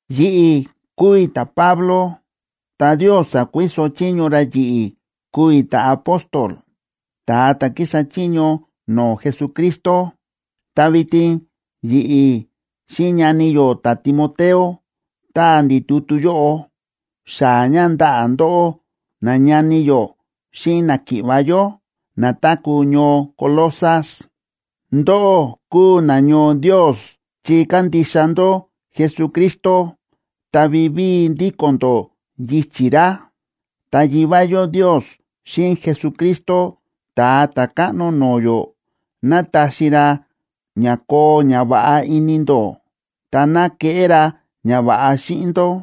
Yi̱ꞌi̱ kúu i̱ ta̱Pablo, ta Ndios sa̱kuiso chiño ra yi̱ꞌi̱ kúu i̱ ta̱apóstol, ta̱a ta̱ kísa chiño no̱o̱ Jesucristo. Ta vitin yi̱ꞌi̱ xíꞌin ñani yó ta̱Timoteo táa ndi̱ tutu yóꞌo, xaa̱ ña ndaꞌa̱ ndóꞌó, nañani yó xíꞌin náki̱ꞌva̱ yó na táku̱ ñoo Colosas. Ndóꞌó kúu nañoo Ndios chi kándixa ndó Jesucristo ta vivíi ndíko̱n ndó yichi̱ ra. Ta Yivá yó Ndios xíꞌin Jesucristo Ta̱a Ta̱káꞌno no̱o̱ yó, ná taxi ra ña koo ñava̱ꞌa ini ndó, ta ná keꞌé ra ñava̱ꞌa xíꞌin ndó.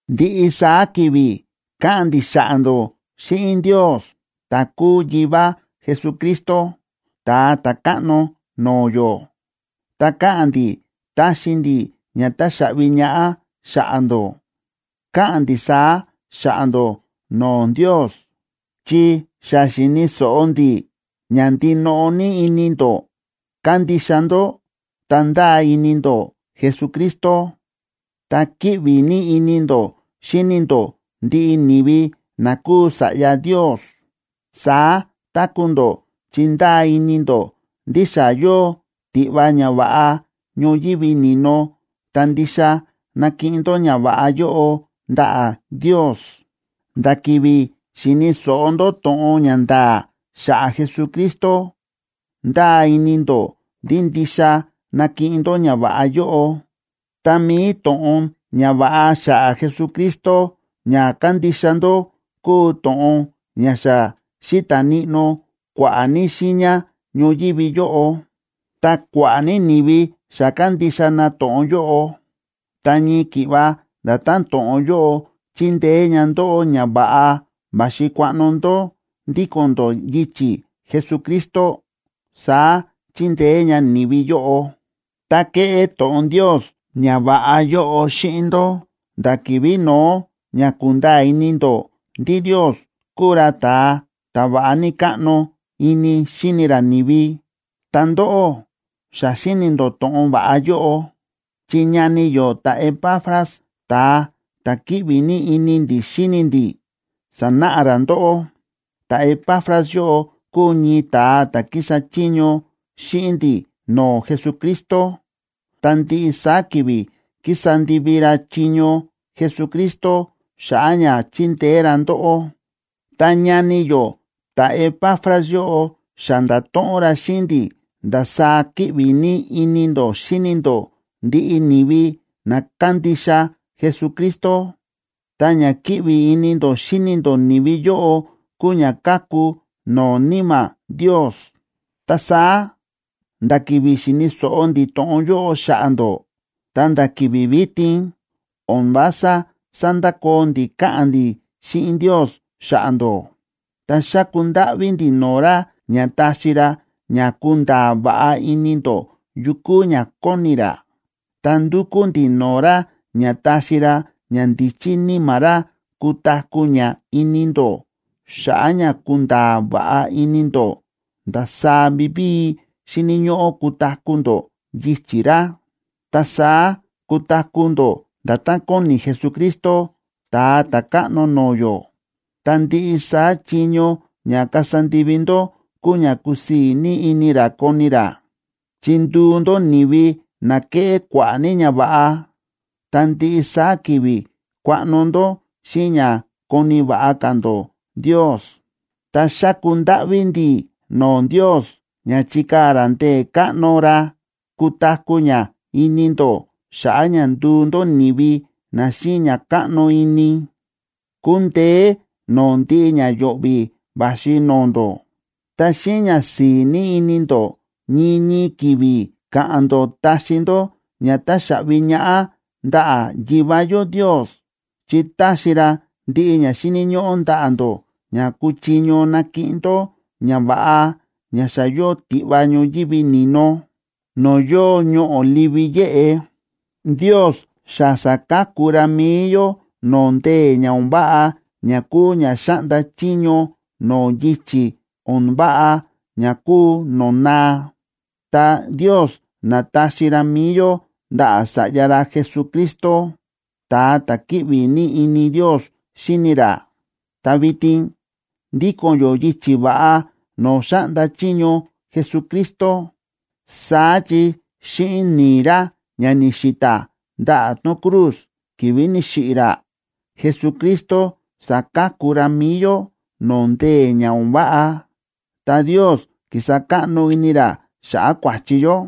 Ndiꞌi saá ki̱vi̱ káꞌa̱n ndi̱ xa̱ꞌa̱ ndó xíꞌin Ndios, ta̱ kúu Yivá Jesucristo, Ta̱a Ta̱káꞌno no̱o̱ yó. Ta káꞌa̱n ndi̱ táxi ndi̱ ña táxaꞌvi ñaꞌá xa̱ꞌa̱ ndó. Káꞌa̱n ndi̱ saá xa̱ꞌa̱ ndó no̱o̱ Ndios, chi xa xi̱ni̱ so̱ꞌo ndi̱ ña ndinoꞌo ní ini ndó kándixa ndó ta ndáa ini ndó Jesucristo, ta kíꞌvi ní ini ndó xíni ndó ndiꞌi ni̱vi na kúu sa̱ꞌya Ndios. Saá táku̱ ndó chi ndáa ini ndó ndí xa yóo tiꞌva ñava̱ꞌa ñoyívi ni̱no ta ndixa nakiꞌin ndó ñava̱ꞌa yóꞌo ndaꞌa̱ Ndios. Nda̱ ki̱vi̱ xi̱ni̱ so̱ꞌo ndó to̱ꞌon ña nda̱a̱ xa̱ꞌa̱ Jesucristo ndáa ini ndó ndí ndixa nakiꞌin ndó ñava̱ꞌa yóꞌo. Ta mi̱i to̱ꞌon ñava̱ꞌa xa̱ꞌa̱ Jesucristo ña kándixa ndó kúu to̱ꞌon ña xa xíta̱ níꞌnó kua̱ꞌa̱ ní xiiña ñoyívi yóꞌo, ta kua̱ꞌa̱ ní ni̱vi xa kándixa na to̱ꞌon yóꞌo. Ta ñii ki̱ꞌva nda̱tán to̱ꞌon yóꞌo chíndeé ña ndóꞌó ña va̱ꞌa va̱xi kuaꞌno ndó ndíko̱n ndó yichi̱ Jesucristo, saá chíndeé ña ni̱vi yóꞌo. Ta kéꞌé to̱ꞌon Ndios ñava̱ꞌa yóꞌo xíꞌin ndó nda̱ ki̱vi̱ no̱ó ña ku̱nda̱a̱ ini ndó ndí Ndios kúu ra ta̱a ta̱ va̱ꞌa ní káꞌno ini xíni ra ni̱vi. Ta ndóꞌó xa xíni̱ ndó to̱ꞌon va̱ꞌa yóꞌo, chi ñani yó ta̱Epafras, ta̱a ta̱ kíꞌvi ní ini ndi̱ xíni ndi̱, sa̱náꞌa ra ndóꞌó. Ta̱Epafras yóꞌo kúu ñii ta̱a ta̱ kísa chiño xíꞌin ndi̱ no̱o̱ Jesucristo, ta ndiꞌi saá ki̱vi̱ kísa ndivi ra chiño Jesucristo xa̱ꞌa̱ ña chindeé ra ndóꞌó. Ta ñani yó ta̱Epafras yóꞌo xa nda̱to̱ꞌon ra xíꞌin ndi̱ ndasaá kíꞌvi ní ini ndó xíni ndó ndiꞌi ni̱vi na kándixa Jesucristo. Ta ña kíꞌvi ini ndó xíni ndó ni̱vi yóꞌo kúu ña káku no̱o̱ Níma̱ Ndios. Ta saá nda̱ ki̱vi̱ xi̱ni̱ so̱ꞌo ndi̱ to̱ꞌon yóꞌo xa̱ꞌa̱ ndó ta̱nda̱ ki̱vi̱ vitin, o̱n vása sándakoo ndi̱ káꞌa̱n ndi̱ xíꞌin Ndios xa̱ꞌa̱ ndó. Ta xáku ndáꞌví ndi̱ no̱o̱ ra ña taxi ra ña kunda̱a̱ va̱ꞌa ini ndó yu kúu ña kóni ra. Ta ndúkú ndi̱ no̱o̱ ra ña taxi ra ñandíchí Níma̱ ra kutaku̱ ña ini ndó xa̱ꞌa̱ ña kunda̱a̱ va̱ꞌa ini ndó ndasaá vivíi xíni̱ ñóꞌó kutaku̱ ndó yichi̱ ra. Ta saá kutaku̱ ndó nda̱tán kóni Jesucristo, Ta̱a Ta̱káꞌno no̱o̱ yó, ta ndiꞌi saá chiño ña kasa ndivi ndó kuu ña kusii̱ ní ini ra koni ra, chi nduu ndó ni̱vi na keꞌé kua̱ꞌa̱ ní ñava̱ꞌa ta ndiꞌi saá ki̱vi̱ kuaꞌno ndó xíꞌin ña koni̱ va̱ꞌa ka̱ ndó Ndios. Ta xáku ndáꞌví ndi̱ no̱o̱ Ndios ña chikaa̱ ra ndee̱ káꞌno ra kutaku̱ ña ini ndó xa̱ꞌa̱ ña nduu ndó ni̱vi na xíꞌin ña káꞌno ini, kundeé no̱o̱ ndiꞌi ña yo̱ꞌvi̱ va̱xi no̱o̱ ndó. Ta xíꞌin ñasi̱i̱ ní ini ndó ñii ñii ki̱vi̱ ka̱ꞌa̱n ndó taxi ndó ña táxaꞌvi ñaꞌá ndaꞌa̱ Yivá yó Ndios chi táxi ra ndiꞌi ña xíni̱ ñóꞌó ndaꞌa̱ ndó ña kúchiño nakiꞌin ndó ñava̱ꞌa ña xa yóo tiꞌva ñoyívi ni̱no, no̱o̱ yóo ñoꞌo̱ livi yéꞌe. Ndios xa sa̱ka̱ku ra mi̱i yó no̱o̱ ndee̱ ña o̱n váꞌa ña kúu ña xáꞌnda chiño no̱o̱ yichi̱ o̱n váꞌa ña kúu no̱o̱ naa, ta Ndios na̱taxi ra mi̱i yó ndaꞌa̱ Sa̱ꞌya ra Jesucristo, ta̱a ta̱ kíꞌvi ní ini Ndios xíni ra, ta vitin ndíko̱n yó yichi̱ va̱ꞌa no̱o̱ xáꞌnda chiño Jesucristo. Saá chi xíꞌin ni̱i̱ ra ña ni̱xi̱ta̱ ndaꞌa̱ tón cruz ki̱vi̱ ni̱xiꞌi̱ ra, Jesucristo sa̱ka̱ku ra mi̱i yó no̱o̱ ndee̱ ña o̱n váꞌa, ta Ndios ki̱sa káꞌno ini ra xa̱ꞌa̱ kua̱chi yó.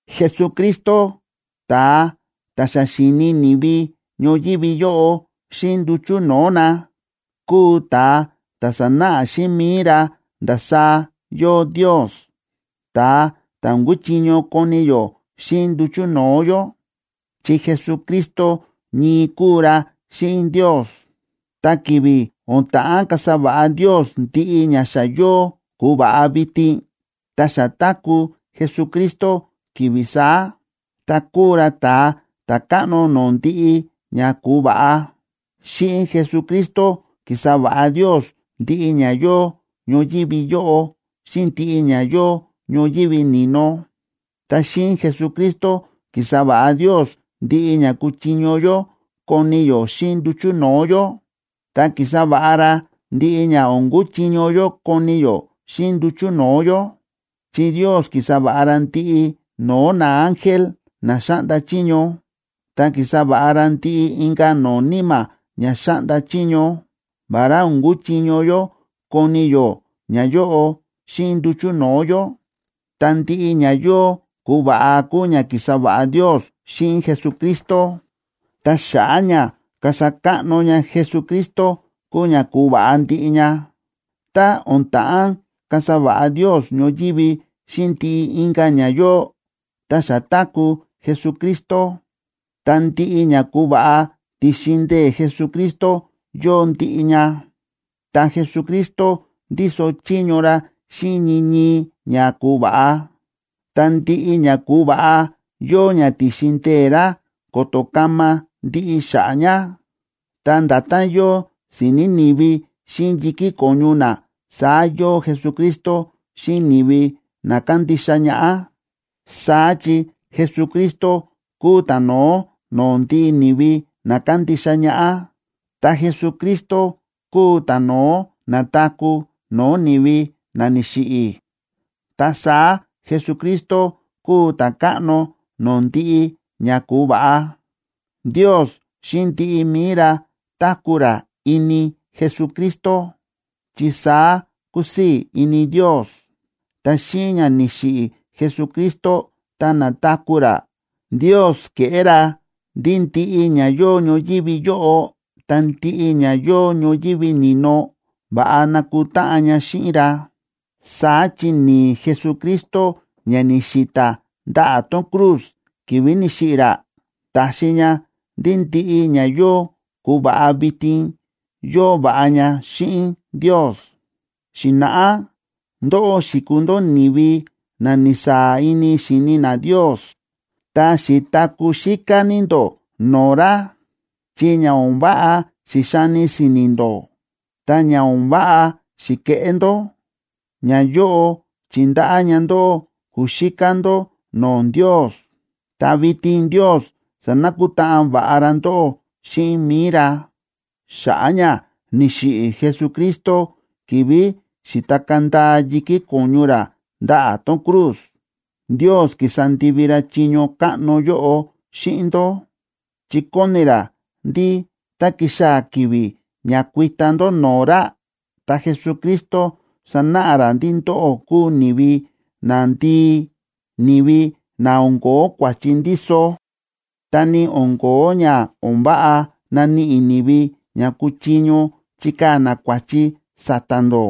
Jesucristo, ta̱a ta̱ xa xi̱ni ni̱vi ñoyívi yóꞌo xíꞌin nduchu̱ no̱o̱ na, kúu ta̱a ta̱ sa̱náꞌa xíꞌin mi̱i ra ndasaá yóo Ndios, ta̱a ta̱ o̱n kúchiño koni yó xíꞌin nduchu̱ no̱o̱ yó. Chi Jesucristo ñii kúu ra xíꞌin Ndios, ta ki̱vi̱ o̱n ta̱ꞌán kasa va̱ꞌa Ndios ndiꞌi ña xa yóo ku̱va̱ꞌa vitin, ta xa táku̱ Jesucristo ki̱vi̱ saá, ta kúu ra ta̱a ta̱káꞌno no̱o̱ ndiꞌi ña ku̱va̱ꞌa. Xíꞌin Jesucristo ki̱sa va̱ꞌa Ndios ndiꞌi ña yóo ñoyívi yóꞌo xíꞌin ndiꞌi ña yóo ñoyívi ni̱no. Ta xíꞌin Jesucristo ki̱sa va̱ꞌa Ndios ndiꞌi ña kúchiño yó koni yó xíꞌin nduchu̱ no̱o̱ yó, ta ki̱sa va̱ꞌa ra ndiꞌi ña o̱n kúchiño yó koni yó xíꞌin nduchu̱ no̱o̱ yó. Chi Ndios ki̱sa va̱ꞌa ra ndiꞌi no̱o̱ naángel na xáꞌnda chiño, ta ki̱sa va̱ꞌa ra ndiꞌi inka̱ no̱o̱ níma̱ ña xáꞌnda chiño, vará o̱n kúchiño yó koni yó ñayóꞌo xíꞌin nduchu̱ no̱o̱ yó. Ta ndiꞌi ña yóo ku̱va̱ꞌa kúu ña ki̱sa va̱ꞌa Ndios xíꞌin Jesucristo, ta xa̱ꞌa̱ ña kasa káꞌno ña Jesucristo kúu ña ku̱va̱ꞌa ndiꞌi ña. Tá o̱n ta̱ꞌán kasa va̱ꞌa Ndios ñoyívi xíꞌin ndiꞌi inka̱ ña yóo, ta xa táku̱ Jesucristo. Ta ndiꞌi ña ku̱va̱ꞌa, ti̱xin ndee̱ Jesucristo yóo ndiꞌi ña, ta Jesucristo ndíso chiño ra xíꞌin ñii ñii ña ku̱va̱ꞌa, ta ndiꞌi ña ku̱va̱ꞌa yóo ña ti̱xin ndee̱ ra ko̱to̱ kama ndiꞌi xa̱ꞌa̱ ña. Ta nda̱tán yóo si̱ni̱ ni̱vi xíꞌin yi̱kí ko̱ñu na, saá yóo Jesucristo xíꞌin ni̱vi na kándixa ñaꞌá. Saá chi Jesucristo kúu ta̱no̱ó no̱o̱ ndiꞌi ni̱vi na kándixa ñaꞌá, ta Jesucristo kúu ta̱no̱ó na̱taku̱ no̱o̱ ni̱vi na ni̱xiꞌi̱. Ta saá Jesucristo kúu ta̱káꞌno no̱o̱ ndiꞌi ña ku̱va̱ꞌa. Ndios xíꞌin ndiꞌi mi̱i ra táku̱ ra ini Jesucristo, chi saá kúsii̱ ini Ndios. Ta xíꞌin ña ni̱xiꞌi̱ Jesucristo ta na̱taku̱ ra, Ndios ke̱ꞌé ra ndí ndiꞌi ña yóo ñoyívi yóꞌo ta ndiꞌi ña yóo ñoyívi ni̱no, va̱ꞌa na̱kutáꞌan ña xíꞌin ra. Saá chi ni̱i̱ Jesucristo ña ni̱xi̱ta̱ ndaꞌa̱ tón cruz ki̱vi̱ ni̱xiꞌi̱ ra, ta̱xi ña ndí ndiꞌi ña yóo ku̱va̱ꞌa vitin yóo va̱ꞌa ña xíꞌin Ndios. Xi̱na̱ꞌá ndóꞌó xi̱kuu ndó ni̱vi na ni̱saa̱ ini xi̱ni na Ndios, ta xi̱taku̱ xíká ní ndó no̱o̱ ra, chi ña o̱n váꞌa xi̱xani si̱ni̱ ndó, ta ña o̱n váꞌa xi̱ke̱ꞌé ndó, ñayóꞌo chi̱ndaꞌá ña ndóꞌó ku̱xíká ndó no̱o̱ Ndios. Ta vitin Ndios sa̱nakutáꞌan va̱ꞌa ra ndóꞌó xíꞌin mi̱i ra, xa̱ꞌa̱ ña ni̱xiꞌi̱ Jesucristo ki̱vi̱ xi̱takaa̱ ndaa yi̱kí ko̱ñu ra ndaꞌa̱ tón cruz. Ndios ki̱sa ndivi ra chiño káꞌno yóꞌo xíꞌin ndó, chi kóni ra ndí tá kixaa̱ ki̱vi̱ ña kuita ndó no̱o̱ ra, ta Jesucristo sanáꞌa ra ndí ndóꞌó kúu ni̱vi nandii, ni̱vi na o̱n ko̱ó kua̱chi ndíso, ta ni o̱n ko̱ó ña o̱n váꞌa naníꞌi ni̱vi ña kuchiño chikaa̱ na kua̱chi sa̱ta̱ ndó.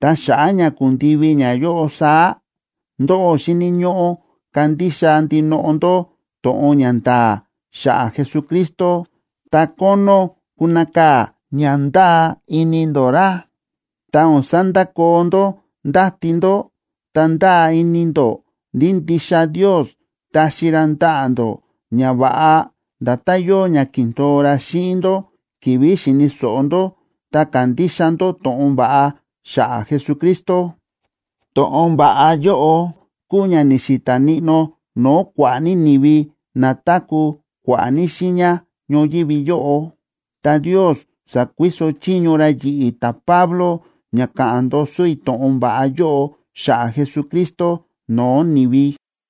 Ta xa̱ꞌa̱ ña kundivi ñayóꞌo saá, ndóꞌó xíni̱ ñóꞌó kandixa ndinoꞌo ndó to̱ꞌon ña nda̱a̱ xa̱ꞌa̱ Jesucristo ta kónó kunakaa̱ ña ndáa ini ndó. Ta o̱n sandakoo ndó ndáti ndó ta ndáa ini ndó ndí ndixa Ndios taxi ra ndaꞌa̱ ndó ñava̱ꞌa nda̱tán yóo ña ki̱ndo̱o ra xíꞌin ndó ki̱vi̱ xi̱ni̱ so̱ꞌo ndó ta ka̱ndixa ndó to̱ꞌon va̱ꞌa xa̱ꞌa̱ Jesucristo. To̱ꞌon va̱ꞌa yóꞌo kúu ña ni̱xi̱ta̱ níꞌnó no̱o̱ kua̱ꞌa̱ ní ni̱vi na táku̱ kua̱ꞌa̱ ní xiiña ñoyívi yóꞌo. Ta Ndios sa̱kuiso chiño ra yi̱ꞌi̱ ta̱Pablo ña ka̱ꞌa̱n ndoso i̱ to̱ꞌon va̱ꞌa yóꞌo xa̱ꞌa̱ Jesucristo no̱o̱ ni̱vi.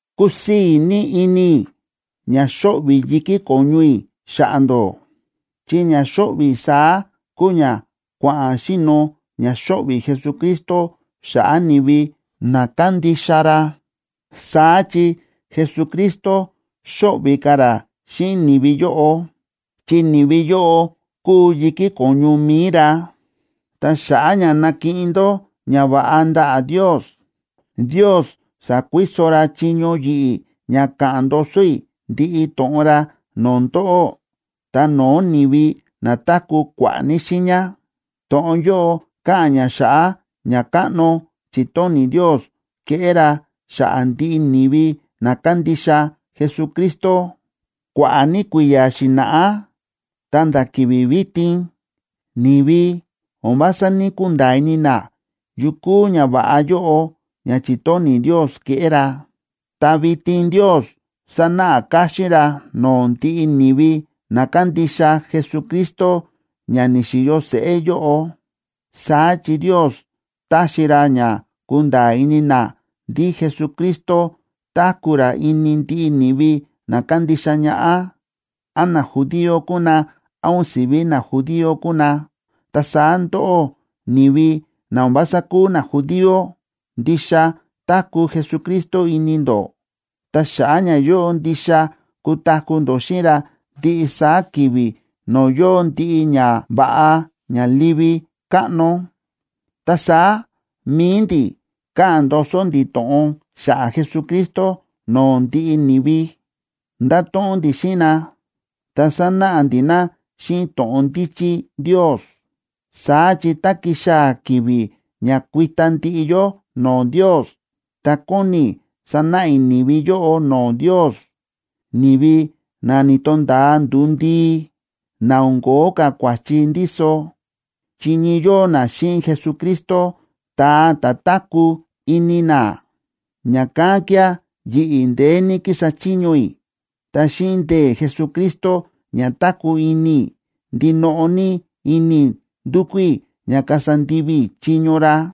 Kúsii̱ ní ini i̱ ña xóꞌvi̱ yi̱kí ko̱ñu i̱ xa̱ꞌa̱ ndó, chi ña xóꞌvi̱ i̱ saá kúu ña kua̱ꞌa̱n xi̱no̱ ña xóꞌvi̱ Jesucristo xa̱ꞌa̱ ni̱vi na kándixa ra. Saá chi Jesucristo xóꞌvi̱ ka̱ ra xíꞌin ni̱vi yóꞌo, chi ni̱vi yóꞌo kúu yi̱kí ko̱ñu mi̱i ra. Ta xa̱ꞌa̱ ña nakiꞌin ndó ñava̱ꞌa ndaꞌa̱ Ndios, Ndios sa̱kuiso ra chiño yi̱ꞌi̱ ña ka̱ꞌa̱n ndoso i̱ ndiꞌi to̱ꞌon ra no̱o̱ ndóꞌó ta no̱o̱ ni̱vi na táku̱ kua̱ꞌa̱ ní xiiña. To̱ꞌon yóꞌo káꞌa̱n ña xa̱ꞌa̱ ñakáꞌno chi̱tóni̱ Ndios keꞌé ra xa̱ꞌa̱ ndiꞌi ni̱vi na kándixa Jesucristo. Kua̱ꞌa̱ ní kui̱ya̱ xi̱na̱ꞌá ta̱nda̱ ki̱vi̱ vitin, ni̱vi o̱n vása ní‑kunda̱a̱ ini na yu kúu ñava̱ꞌa yóꞌo ña chi̱tóni̱ Ndios keꞌé ra, ta vitin Ndios sa̱náꞌa káxín ra no̱o̱ ndiꞌi ni̱vi na kándixa Jesucristo ña ni̱xi̱yo seꞌé yóꞌo. Saá chi Ndios táxi ra ña kunda̱a̱ ini na ndí Jesucristo táku̱ ra ini ndiꞌi ni̱vi na kándixa ñaꞌá, án najudío kúu na, án o̱n si̱ví najudío kúu na. Ta saá ndóꞌó, ni̱vi na o̱n vása kúu najudío, ndixa táku̱ Jesucristo ini ndó. Ta xa̱ꞌa̱ ñayóꞌo ndixa kutaku̱ ndó xíꞌin ra ndiꞌi saá ki̱vi̱ no̱o̱ yóo ndiꞌi ñava̱ꞌa ña livi káꞌno. Ta saá mi̱i ndi̱ káꞌa̱n ndoso ndi̱ to̱ꞌon xa̱ꞌa̱ Jesucristo no̱o̱ ndiꞌi ni̱vi. Ndáto̱ꞌon ndi̱ xíꞌin na, ta sánáꞌa ndi̱ na xíꞌin to̱ꞌon ndíchí Ndios. Saá chi tá kixaa̱ ki̱vi̱ ña kuita ndiꞌi yó no̱o̱ Ndios, ta kóni i̱ sanáꞌa i̱ ni̱vi yóꞌo no̱o̱ Ndios, ni̱vi na ni̱to̱nda̱a nduu ndii, na o̱n ko̱ó ka̱ kua̱chi ndíso, chi ñii yóo na xíꞌin Jesucristo, ta̱a ta̱ táku̱ ini na. Ña̱kán kía̱ yi̱ꞌi̱ ndeé ní kísa chiño i̱, ta xíꞌin ndee̱ Jesucristo ña táku̱ ini i̱, ndinoꞌo ní ini i̱ ndúkú i̱ ña kasa ndivi i̱ chiño ra.